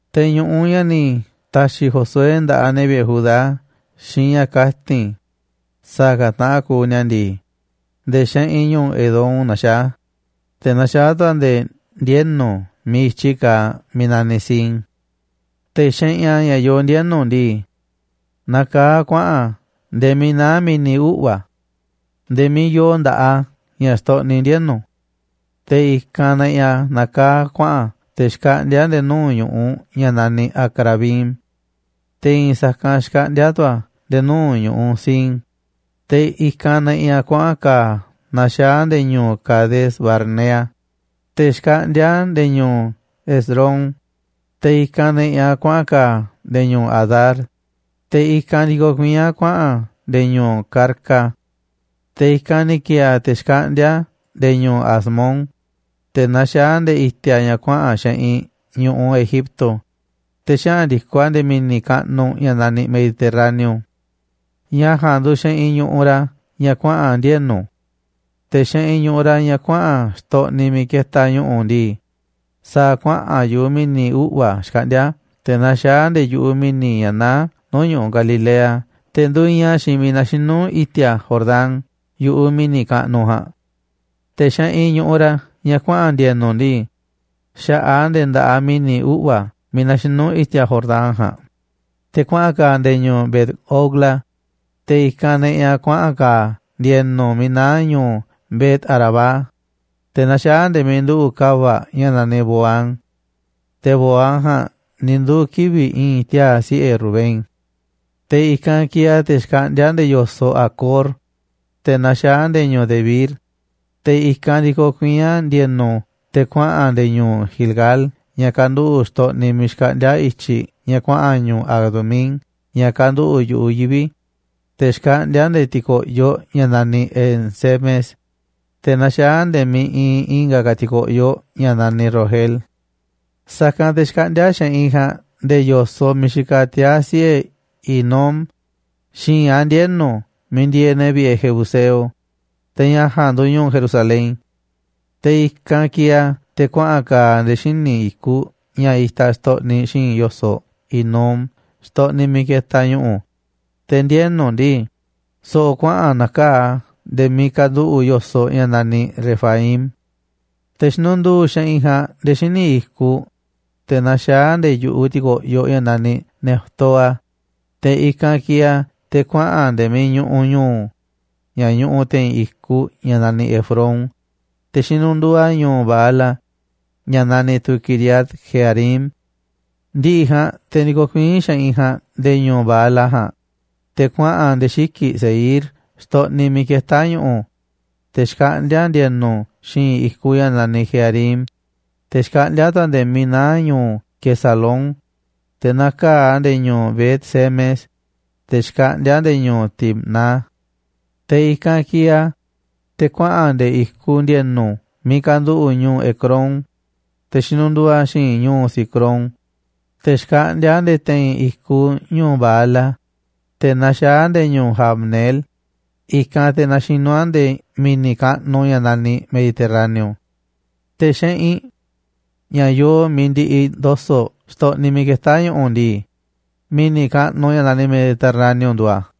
Te̱ ñu̱ꞌuꞌ ña̱ ni̱ ta̱xi̱ Josué nda̱ꞌaꞌ ne̱ vi̱ꞌe̱ Judá xiinꞌ ña̱ kati̱n sa̱a̱ ka̱ taꞌan kuuꞌ ni̱a̱ ndii, nde̱e̱ xeꞌinꞌ ñu̱ꞌuꞌ Edom naxaá a̱, te̱ naxaá tu̱ a̱ nde̱e̱ ndienu̱ miiꞌ i̱tyi kaaꞌ miiꞌ naniꞌ Zin. Te̱ xeꞌinꞌ a̱ ña̱ yoo ndienu̱ ndii, nakaá a̱ kuaꞌa̱n a̱ nde̱e̱ miiꞌ naá Mi̱ni̱ Uꞌva̱ nde̱e̱ miiꞌ yoo nda̱ꞌaꞌ a̱ ña̱ xtoꞌniꞌ ndienu̱. Te̱ i̱kanꞌ neꞌiꞌ a̱ nakaá a̱ kuaꞌa̱n a̱ te̱ xkaꞌndíá nde̱e̱ nuu̱ꞌ ñu̱ꞌuꞌ ña̱ naniꞌ Acrabim, te̱ i̱i̱n sa̱kanꞌ xkaꞌndíá a̱ tu̱ a̱ nde̱e̱ nuu̱ꞌ ñu̱ꞌuꞌ Zin. Te̱ i̱kanꞌ neꞌiꞌ a̱ kuaꞌa̱n ka̱a̱ a̱ naxaá a̱ nde̱e̱ ñu̱u̱ Cades-barnea, te̱ xkaꞌndíá a̱ nde̱e̱ ñu̱u̱ Hezrón, te̱ i̱kanꞌ neꞌiꞌ a̱ kuaꞌa̱n ka̱a̱ a̱ nde̱e̱ ñu̱u̱ Adar, te̱ i̱kanꞌ ndikoꞌ kuiín a̱ kuaꞌa̱n a̱ nde̱e̱ ñu̱u̱ Carca. Te̱ i̱kanꞌ ni̱ ki̱e̱e̱ a̱ te̱ xkaꞌndíá a̱ nde̱e̱ ñu̱u̱ Asmón, te̱ naxaá a̱ nde̱e̱ i̱ti̱a̱ ña̱ kuaꞌa̱n xeꞌinꞌ ñu̱ꞌuꞌ Egipto, te̱ xaꞌa̱n ndi̱koꞌ a̱ nde̱e̱ mi̱ni̱ kaꞌnuꞌ ña̱ naniꞌ Mediterráneo. Ña̱ ja̱a̱nꞌ nduuꞌ xeꞌinꞌ ñu̱ꞌuꞌ ra̱ ña̱ kuaꞌa̱n ndienu̱. Te̱ xeꞌinꞌ ñu̱ꞌuꞌ ra̱ ña̱ kuaꞌa̱n xtoꞌniꞌ miiꞌ ketaꞌ ñu̱ꞌu̱ ndii, sa̱a̱ kuaꞌa̱n yu̱ꞌuꞌ Mi̱ni̱ Uꞌva̱ xkaꞌndíá a̱ te̱ naxaá a̱ nde̱e̱ yu̱ꞌuꞌ miiꞌ ña̱ naá nuu̱ꞌ ñu̱ꞌuꞌ Galilea, te̱ nduiinꞌ a̱ xiinꞌ miiꞌ naxinú i̱ti̱a̱ Jordán yu̱ꞌuꞌ mi̱ni̱ kaꞌnuꞌ ja̱a̱nꞌ. Te̱ xeꞌinꞌ ñu̱ꞌuꞌ ra̱ ña̱ kuaꞌa̱n ndi̱e̱nu̱ ndii, xa̱ꞌaꞌ a̱ nde̱e̱ nda̱ꞌaꞌ mi̱ni̱ uꞌva̱ miiꞌ naxinú i̱ti̱a̱ Jordán ja̱a̱nꞌ, te̱ kuaꞌa̱n ka̱a̱ a̱ nde̱e̱ ñu̱u̱ Bet-hogla, i̱kanꞌ te̱ ne̱ꞌi̱ a̱ kuaꞌa̱n ka̱a̱ a̱ ndi̱e̱nu̱ miiꞌ naá ñu̱u̱ Bet-arabá, te̱ naxaá a̱ nde̱e̱ miiꞌ nduꞌu̱ꞌ ka̱va̱ꞌ ña̱ naniꞌ Bohán. Te̱ Bohán ja̱a̱nꞌ ni̱ nduu̱ kivi̱ꞌ i̱i̱n tiaa̱ siꞌe̱ Rubén. Te̱ i̱kanꞌ kieeꞌ a̱ te̱ xkaꞌndíá nde̱e̱ yo̱soꞌ Acor, te̱ naxaá a̱ nde̱e̱ ñu̱u̱ Debir. Te̱ i̱kanꞌ ndikoꞌ kuiín a̱ ndi̱e̱nu̱ te̱ kuaꞌa̱n a̱ nde̱e̱ ñu̱u̱ Gilgal ña̱ kanduꞌu̱ꞌ xtoꞌniꞌ miiꞌ xkaꞌndíá i̱tyiꞌ ña̱ kuaꞌa̱n ñu̱u̱ Adumín ña̱ kanduꞌu̱ꞌ yu̱ꞌuꞌ yivi̱. Te̱ xkaꞌndíá a̱ nde̱e̱ ti̱ko̱ꞌyoꞌ ña̱ naniꞌ En-semes, te̱ naxaá a̱ nde̱e̱ miiꞌ iinꞌ i̱nga̱ ka̱ ti̱ko̱ꞌyoꞌ ña̱ naniꞌ Rogel. Sa̱kanꞌ te̱ xkaꞌndíá xeꞌinꞌ ja̱a̱nꞌ nde̱e̱ yo̱soꞌ miiꞌ xikaꞌ tiaa̱ siꞌe̱ Hinom xi̱i̱nꞌ a̱ ndienu̱ miiꞌ ndieeꞌ ne̱ vi̱ꞌe̱ jebuseo, te̱ ña̱ ja̱a̱nꞌ nduuꞌ ñu̱u̱ Jerusalén. Te̱ i̱kanꞌ kieeꞌ a̱ te̱ kuaꞌa̱n ka̱a̱ a̱ nde̱e̱ xíniꞌ i̱kuꞌ ña̱ itaꞌ xtoꞌniꞌ xi̱i̱nꞌ yo̱soꞌ Hinom xtoꞌniꞌ miiꞌ ketaꞌ ñu̱ꞌu̱. Te̱ ndienu̱ ndii, so̱ꞌo̱ kuaꞌa̱n na̱kaa̱ꞌ a̱ nde̱e̱ miiꞌ kanduꞌu̱ꞌ yo̱soꞌ ña̱ naniꞌ Refaim. Te̱ xinunduu xeꞌinꞌ ja̱a̱nꞌ nde̱e̱ xíniꞌ i̱kuꞌ, te̱ naxaá nde̱e̱ yu̱ꞌuꞌ ti̱ko̱ꞌyoꞌ ña̱ naniꞌ Neftoa. Te̱ i̱kanꞌ kieeꞌ a̱ te̱ kuaꞌa̱n a̱ nde̱e̱ miiꞌ ñuꞌuꞌ ñu̱u̱ ña̱ ñuꞌuꞌ te̱i̱n i̱kuꞌ ña̱ naniꞌ Efrón, te̱ xinunduu a̱ ñu̱u̱ Baala ña̱ naniꞌ tu̱ Quiriat-jearim. Ndi̱ꞌi̱ ja̱a̱nꞌ te̱ ndikoꞌ kuiín xeꞌinꞌ ja̱a̱nꞌ nde̱e̱ ñu̱u̱ Baala ja̱a̱nꞌ, te̱ kuaꞌa̱n a̱ nde̱e̱ xiki̱ꞌ Seir xtoꞌniꞌ miiꞌ ketá ñu̱ꞌu̱, te̱ xkaꞌndíá ndi̱e̱nu̱ xi̱i̱nꞌ i̱kuꞌ ña̱ naniꞌ Jearim. Te̱ xkaꞌndíá tu̱ a̱ nde̱e̱ miiꞌ naá ñu̱u̱ Quesalón, te̱ nakaa̱ꞌ a̱ nde̱e̱ ñu̱u̱ Bet-semes, te̱ xkaꞌndíá a̱ nde̱e̱ ñu̱u̱ Timna. Te̱ i̱kanꞌ kieeꞌ a̱, te̱ kuaꞌa̱n a̱ nde̱e̱ i̱kuꞌ ndi̱e̱nu̱ miiꞌ kanduꞌu̱ꞌ ñu̱u̱ Ecrón, te̱ xinuduuꞌ a̱ xi̱i̱n ñu̱u̱ Sicrón, te̱ xkaꞌndíá a̱ nde̱e̱ te̱i̱n i̱kuꞌ ñu̱u̱ Baala, te̱ naxaá a̱ nde̱e̱ ñu̱u̱ Jabneel, i̱kanꞌ te̱ naxinú a̱ nde̱e̱ mi̱ni̱ kaꞌnuꞌ ña̱ naniꞌ Mediterráneo. Te̱ xeꞌinꞌ ña̱ yooꞌ miiꞌ ndiꞌiꞌ ndo̱so̱ꞌ xtoꞌniꞌ miiꞌ ketá ñu̱ꞌu̱ ndii, mi̱ni̱ kaꞌnuꞌ ña̱ naniꞌ Mediterráneo nduuꞌ a̱.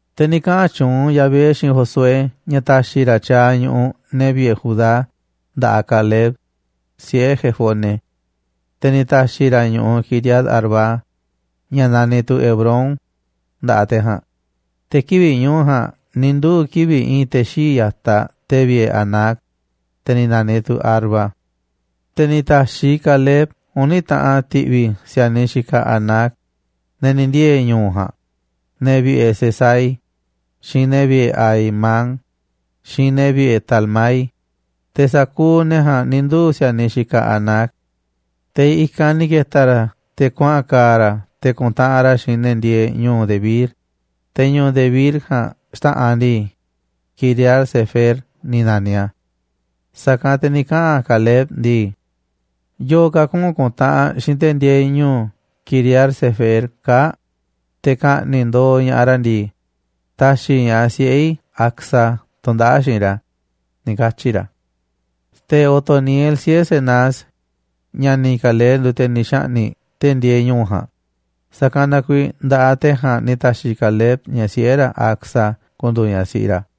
Te̱ ni̱ kaꞌa̱n tyuunꞌ Yahvé xiinꞌ Josué ña̱ ta̱xi̱ ra̱ tyaaꞌ ñu̱ꞌuꞌ ne̱ vi̱ꞌe̱ Judá nda̱ꞌaꞌ Caleb, siꞌe̱ Jefone. Te̱ ni̱ ta̱xi̱ ra̱ ñu̱u̱ Quiriat-arba, ña̱ naniꞌ tu̱ Hebrón, nda̱ꞌaꞌ te̱ ja̱a̱nꞌ. Te̱ kivi̱ꞌ ñu̱u̱ ja̱a̱nꞌ ni̱ nduu̱ kivi̱ꞌ i̱i̱n te̱ xii̱ꞌ ya̱taꞌ te̱ vi̱ꞌe̱ Anac, te̱ ni̱ na̱niꞌ tu̱ Arba. Te̱ ni̱ ta̱xiꞌ Caleb uni̱ taꞌan ti̱ꞌvi̱ ne̱ si̱a̱niꞌ xikaꞌ Anac, ne̱ ni̱ ndiee̱ ñu̱u̱ ja̱a̱nꞌ, ne̱ vi̱ꞌe̱ Sesai, xiinꞌ ne̱ vi̱ꞌe̱ Ahimán, xiinꞌ ne̱ vi̱ꞌe̱ Talmai. Te̱ sa̱kuuꞌ ne̱ ja̱a̱nꞌ ni̱ nduu̱ si̱a̱niꞌ xikaꞌ Anac. Te̱ i̱kanꞌ ni̱ ke̱ta̱ ra̱ te̱ kuaꞌa̱n ka̱a̱ ra̱ te̱ ku̱ntaꞌanꞌ ra̱ xiinꞌ ne̱ ndieeꞌ ñu̱u̱ Debir, te̱ ñu̱u̱ Debir ja̱a̱nꞌ xta̱ꞌanꞌ ndii, Quiriat-sefer ni̱ na̱niꞌ a̱. Sa̱kanꞌ te̱ ni̱ kaꞌa̱n Caleb ndii: ―Yo̱o̱ ka̱ kuꞌu̱n ku̱ntaꞌanꞌ xiinꞌ te̱ ndieeꞌ ñu̱u̱ Quiriat-sefer kaa̱ꞌ, te̱ ka̱ꞌni̱ꞌ ndo̱o̱ ña̱ꞌaꞌ ra̱ ndii, ta̱xi̱ i̱ ñaꞌ siꞌe̱ i̱ Acsa tu̱ndaꞌa̱ꞌ xiinꞌ ra̱ ―ni̱ katyi̱ ra̱. Te̱ Otoniel, siꞌe̱ Cenaz, ña̱ni̱ Caleb nduuꞌ te̱ ni̱ xa̱ꞌni̱ꞌ te̱ ndieeꞌ ñu̱u̱ ja̱a̱nꞌ, sa̱kanꞌ na kuiiꞌ nda̱ꞌaꞌ te̱ ja̱a̱nꞌ ni̱ ta̱xi̱ Caleb ñaꞌ siꞌe̱ ra̱ Acsa ku̱ndu̱u̱ ñaꞌ siꞌi ra̱.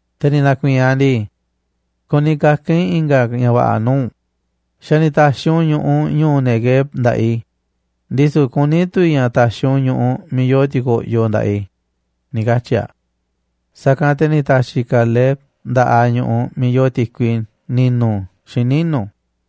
Te̱ ni̱ na̱ku̱i̱i̱n aꞌ ndii: ―Kuni kaka̱n i̱ i̱nga̱ ña̱ va̱ꞌa̱ nuu̱ꞌ u̱nꞌ. Xa̱ ni̱ ta̱xi̱ u̱nꞌ ñu̱ꞌuꞌ ñu̱u̱ Neguev nda̱ꞌaꞌ i̱, ndisu̱ kuní tu̱ i̱ ña̱ ta̱xi̱ u̱nꞌ ñu̱ꞌuꞌ miiꞌ yoo ti̱ko̱ꞌyoꞌ nda̱ꞌaꞌ i̱ ―ni̱ katyi̱ aꞌ. Sa̱kanꞌ te̱ ni̱ ta̱xi̱ Caleb nda̱ꞌaꞌ aꞌ ñu̱ꞌuꞌ miiꞌ yoo ti̱kui ni̱nu̱ xiinꞌ ninu̱.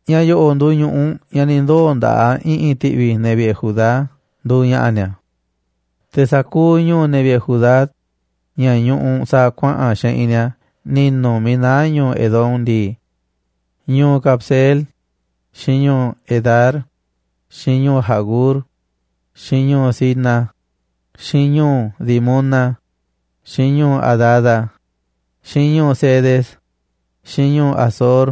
Ña̱ yo̱ꞌo̱ꞌ nduuꞌ ñu̱ꞌuꞌ ña̱ ni̱ ndoo̱ nda̱ꞌaꞌ i̱ꞌi̱n ti̱ꞌvi̱ ne̱ vi̱ꞌe̱ Judá nduuꞌ ña̱ꞌa̱ ni̱a̱. Te̱ sa̱kuuꞌ ñu̱u̱ ne̱ vi̱ꞌe̱ Judá, ña̱ ñuꞌuꞌ sa̱a̱ kuaꞌa̱n xeꞌinꞌ ni̱a̱ ninu̱ miiꞌ naá ñu̱ꞌuꞌ Edom ndii: ñu̱u̱ Cabseel, xiinꞌ ñu̱u̱ Edar, xiinꞌ ñu̱u̱ Jagur, xiinꞌ ñu̱u̱ Cina, xiinꞌ ñu̱u̱ Dimona, xiinꞌ ñu̱u̱ Adada, xiinꞌ ñu̱u̱ Cedes, xiinꞌ ñu̱u̱ Hazor,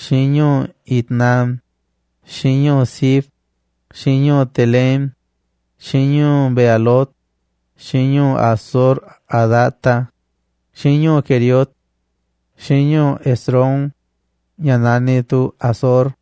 xiinꞌ ñu̱u̱ Itnán, xiinꞌ ñu̱u̱ Zif, xiinꞌ ñu̱u̱ Telem, xiinꞌ ñu̱u̱ Bealot, xiinꞌ ñu̱u̱ Hazor-hadata, xiinꞌ ñu̱u̱ Queriot, xiinꞌ ñu̱u̱ Hezrón, (ña̱ naniꞌ tu̱ Hazor),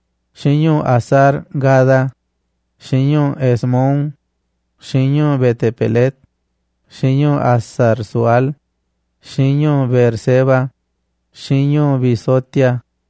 xiinꞌ ñu̱u̱ Hazar-gada, xiinꞌ ñu̱u̱ Hesmón, xiinꞌ ñu̱u̱ Bet-pelet, xiinꞌ ñu̱u̱ Hazar-sual, xiinꞌ ñu̱u̱ Beerseba, xiinꞌ ñu̱u̱ Bizotia,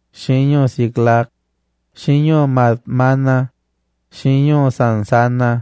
xiinꞌ ñu̱u̱ Siclag, xiinꞌ ñu̱u̱ Madmana, xiinꞌ ñu̱u̱ Sansana,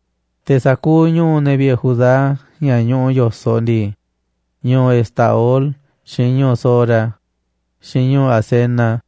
Te̱ sa̱kuuꞌ ñu̱u̱ ne̱ vi̱ꞌe̱ Judá ña̱ ñuꞌuꞌ yo̱soꞌ ndii: ñu̱u̱ Estaol, xiinꞌ ñu̱u̱ Zora, xiinꞌ ñu̱u̱ Asena,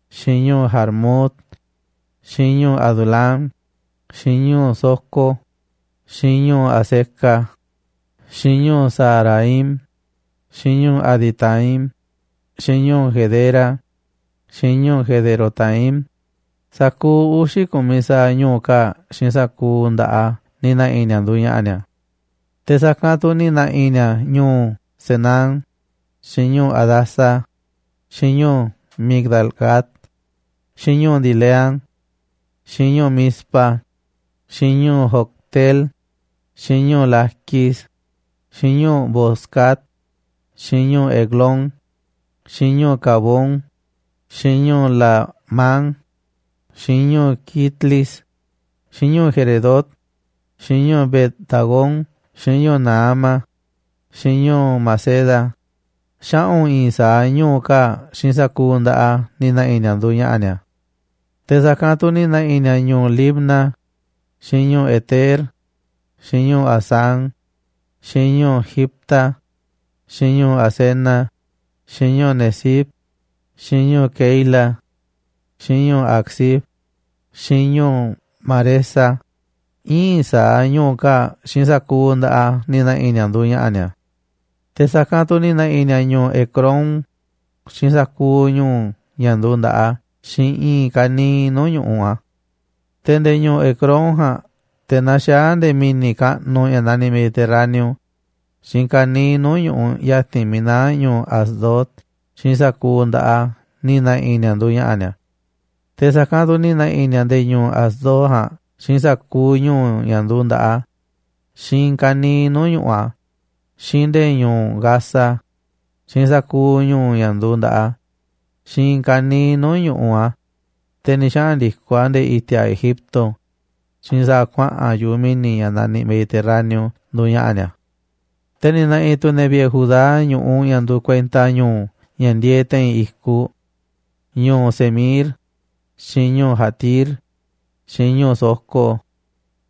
xiinꞌ ñu̱u̱ Jarmut, xiinꞌ ñu̱u̱ Adulam, xiinꞌ ñu̱u̱ Soco, xiinꞌ ñu̱u̱ Azeca, xiinꞌ ñu̱u̱ Saaraim, xiinꞌ ñu̱u̱ Aditaim, xiinꞌ ñu̱u̱ Gedera, xiinꞌ ñu̱u̱ Gederotaim, sa̱kuuꞌ uxi̱ ku̱miꞌ saaꞌ ñu̱u̱ kaa̱ꞌ xiinꞌ sa̱kuuꞌ nda̱ꞌaꞌ a̱ ni̱ na̱ꞌi̱ ni̱a̱ nduuꞌ ña̱ꞌa̱ ni̱a̱. Te̱ sa̱kanꞌ tu̱ ni̱ na̱ꞌi̱ ni̱a̱ ñu̱u̱ Zenán, xiinꞌ ñu̱u̱ Hadasa, xiinꞌ ñu̱u̱ Migdal-gad, xiinꞌ ñu̱u̱ Dileán, xiinꞌ ñu̱u̱ Mizpa, xiinꞌ ñu̱u̱ Jocteel, xiinꞌ ñu̱u̱ Laquis, xiinꞌ ñu̱u̱ Boscat, xiinꞌ ñu̱u̱ Eglón, xiinꞌ ñu̱u̱ Cabón, xiinꞌ ñu̱u̱ Lahmam, xiinꞌ ñu̱u̱ Quitlis, xiinꞌ ñu̱u̱ Geredot, xiinꞌ ñu̱u̱ Bet-dagón, xiinꞌ ñu̱u̱ Naama, xiinꞌ ñu̱u̱ Maceda, xaꞌu̱n i̱i̱n sa̱aꞌ ñu̱u̱ kaa̱ꞌ xiinꞌ sa̱kuuꞌ nda̱ꞌaꞌ a̱ ni̱ na̱ꞌi̱ ni̱a̱ nduuꞌ ña̱ꞌa̱ ni̱a̱. Te̱ sa̱kanꞌ tu̱ ni̱ na̱ꞌi̱ ni̱a̱ ñu̱u̱ Libna, xiinꞌ ñu̱u̱ Eter, xiinꞌ ñu̱u̱ Asán, xiinꞌ ñu̱u̱ Jifta, xiinꞌ ñu̱u̱ Asena, xiinꞌ ñu̱u̱ Nezib, xiinꞌ ñu̱u̱ Keila, xiinꞌ ñu̱u̱ Aczib, xiinꞌ ñu̱u̱ Maresa, íin sa̱aꞌ ñu̱u̱ kaa̱ꞌ xiinꞌ sa̱kuuꞌ nda̱ꞌaꞌ a̱ ni̱ na̱ꞌi̱ ni̱a̱ nduuꞌ ña̱ꞌa̱ ni̱a̱. Te̱ sa̱kanꞌ tu̱ ni̱ na̱ꞌi̱ ni̱a̱ ñu̱u̱ Ecrón, xiinꞌ sa̱kuuꞌ ñu̱u̱ ña̱ nduuꞌ nda̱ꞌaꞌ a̱, xiinꞌ i̱i̱n ka̱niiꞌ nuu̱ꞌ ñu̱ꞌuꞌ a̱. Te̱ nde̱e̱ ñu̱u̱ Ecrón ja̱a̱nꞌ te̱ naxaá a̱ nde̱e̱ mi̱ni̱ kaꞌnuꞌ ña̱ naniꞌ Mediterráneo xiinꞌ ka̱niiꞌ nuu̱ꞌ ñu̱ꞌuꞌ ya̱ti̱n miiꞌ naá ñu̱u̱ Asdod xiinꞌ sa̱kuuꞌ nda̱ꞌaꞌ a̱ ni̱ na̱ꞌi̱ ni̱a̱ nduuꞌ ña̱ꞌa̱ ni̱a̱. Te̱ sa̱kanꞌ tu̱ ni̱ na̱ꞌi̱ ni̱a̱ nde̱e̱ ñu̱u̱ Asdod ja̱a̱nꞌ xiinꞌ sa̱kuuꞌ ñu̱u̱ ña̱ nduuꞌ nda̱ꞌaꞌ a̱, xiinꞌ i̱i̱n ka̱niiꞌ nuu̱ꞌ ñu̱ꞌuꞌ a̱, xiinꞌ nde̱e̱ ñu̱u̱ Gaza, xiinꞌ sa̱kuuꞌ ñu̱u̱ ña̱ nduuꞌ nda̱ꞌaꞌ a̱, xiinꞌ i̱i̱n ka̱niiꞌ nuu̱ꞌ ñu̱ꞌuꞌ a̱, te̱ ni̱ xaꞌa̱n ndi̱koꞌ a̱ nde̱e̱ i̱ti̱a̱ Egipto, xiinꞌ sa̱a̱ kuaꞌa̱n yu̱ꞌuꞌ mi̱ni̱ ña̱ naniꞌ Mediterráneo nduuꞌ ña̱ꞌa̱ ni̱a̱. Te̱ ni̱ na̱ꞌi̱ tu̱ ne̱ vi̱ꞌe̱ Judá ñu̱ꞌuꞌ ña̱ nduuꞌ kuenta ñu̱u̱ ña̱ ndieeꞌ te̱i̱n i̱kuꞌ: ñu̱u̱ Samir, xiinꞌ ñu̱u̱ Jatir, xiinꞌ ñu̱u̱ Soco,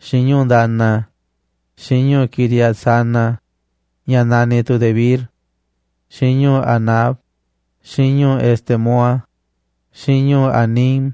xiinꞌ ñu̱u̱ Dana, xiinꞌ ñu̱u̱ Quiriat-sana, ña̱ naniꞌ tu̱ Debir, xiinꞌ ñu̱u̱ Anab, xiinꞌ ñu̱u̱ Estemoa, xiinꞌ ñu̱u̱ Anim,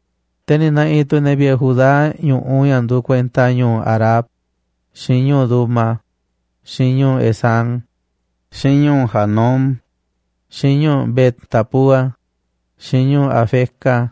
Te̱ ni̱ na̱ꞌi̱ tu̱ ne̱ vi̱ꞌe̱ Judá ñu̱ꞌuꞌ ña̱ nduuꞌ kuenta ñu̱u̱ Arab, xiinꞌ ñu̱u̱ Duma, xiinꞌ ñu̱u̱ Esán, xiinꞌ ñu̱u̱ Janum, xiinꞌ ñu̱u̱ Bet-tapúa, xiinꞌ ñu̱u̱ Afeca,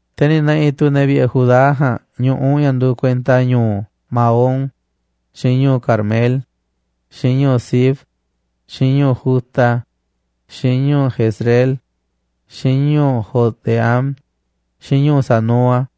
Te̱ ni̱ na̱ꞌi̱ tu̱ ne̱ vi̱ꞌe̱ Judá ja̱a̱nꞌ ñu̱ꞌuꞌ ña̱ nduuꞌ kuenta ñu̱u̱ Maón, xiinꞌ ñu̱u̱ Carmel, xiinꞌ ñu̱u̱ Zif, xiinꞌ ñu̱u̱ Juta, xiinꞌ ñu̱u̱ Jezreel, xiinꞌ ñu̱u̱ Jocdeam, xiinꞌ ñu̱u̱ Zanoa,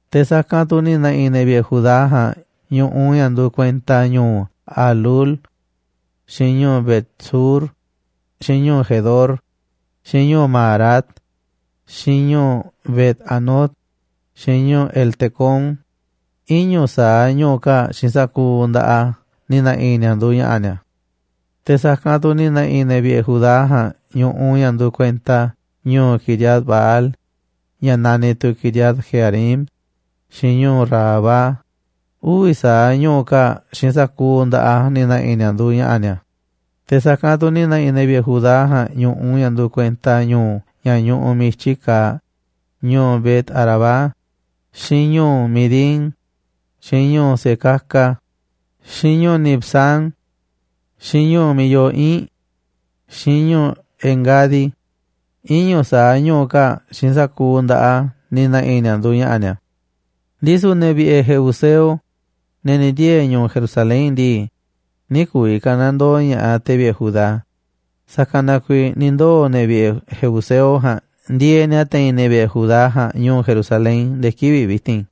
Te̱ sa̱kanꞌ tu̱ ni̱ na̱ꞌi̱ ne̱ vi̱ꞌe̱ Judá ja̱a̱nꞌ ñu̱ꞌuꞌ ña̱ nduuꞌ kuenta ñu̱u̱ Halhul, xiinꞌ ñu̱u̱ Bet-sur, xiinꞌ ñu̱u̱ Gedor, xiinꞌ ñu̱u̱ Maarat, xiinꞌ ñu̱u̱ Bet-anot, xiinꞌ ñu̱u̱ Eltecón, iñu̱ sa̱aꞌ ñu̱u̱ kaa̱ꞌ xiinꞌ sa̱kuuꞌ nda̱ꞌaꞌ ni̱ na̱ꞌi̱ ni̱a̱ nduuꞌ ña̱ꞌa̱ ni̱a̱. Te̱ sa̱kanꞌ tu̱ ni̱ na̱ꞌi̱ ne̱ vi̱ꞌe̱ Judá ja̱a̱nꞌ ñu̱ꞌuꞌ ña̱ nduuꞌ kuenta ñu̱u̱ Quiriat-baal, ña̱ naniꞌ tu̱ Quiriat-jearim, xiinꞌ ñu̱u̱ Rabá, uvi̱ sa̱aꞌ ñu̱u̱ kaa̱ꞌ xiinꞌ sa̱kuuꞌ nda̱ꞌaꞌ a̱ ni̱ na̱ꞌi̱ ni̱a̱ nduuꞌ ña̱ꞌa̱ ni̱a̱. Te̱ sa̱kanꞌ tu̱ ni̱ na̱ꞌi̱ ne̱ vi̱ꞌe̱ Judá ja̱a̱nꞌ ñu̱ꞌuꞌ ña̱ nduuꞌ kuenta ñu̱u̱ ña̱ ñuꞌuꞌ miiꞌ i̱tyi kaaꞌ, ñu̱u̱ Bet-arabá, xiinꞌ ñu̱u̱ Midín, xiinꞌ ñu̱u̱ Secaca, xiinꞌ ñu̱u̱ Nibsán, xiinꞌ Ñu̱u̱ Miiꞌ Yoo Ii̱nꞌ, xiinꞌ ñu̱u̱ En-gadi, iñu̱ sa̱aꞌ ñu̱u̱ kaa̱ꞌ xiinꞌ sa̱kuuꞌ nda̱ꞌaꞌ a̱ ni̱ na̱ꞌi̱ ni̱a̱ nduuꞌ ña̱ꞌa̱ ni̱a̱. Ndisu̱ ne̱ vi̱ꞌe̱ jebuseo, ne̱ ni̱ ndiee̱ ñu̱u̱ Jerusalén ndii, nï̱ ku̱vi̱ ka̱nandoo ña̱ꞌaꞌ te̱ vi̱ꞌe̱ Judá, sa̱kanꞌ na kuiiꞌ ni̱ ndoo̱ ne̱ vi̱ꞌe̱ jebuseo ja̱a̱nꞌ ndieeꞌ na̱ te̱i̱n ne̱ vi̱ꞌe̱ Judá ja̱a̱nꞌ ñu̱u̱ Jerusalén nde̱e̱ kivi̱ꞌ vi̱ti̱n.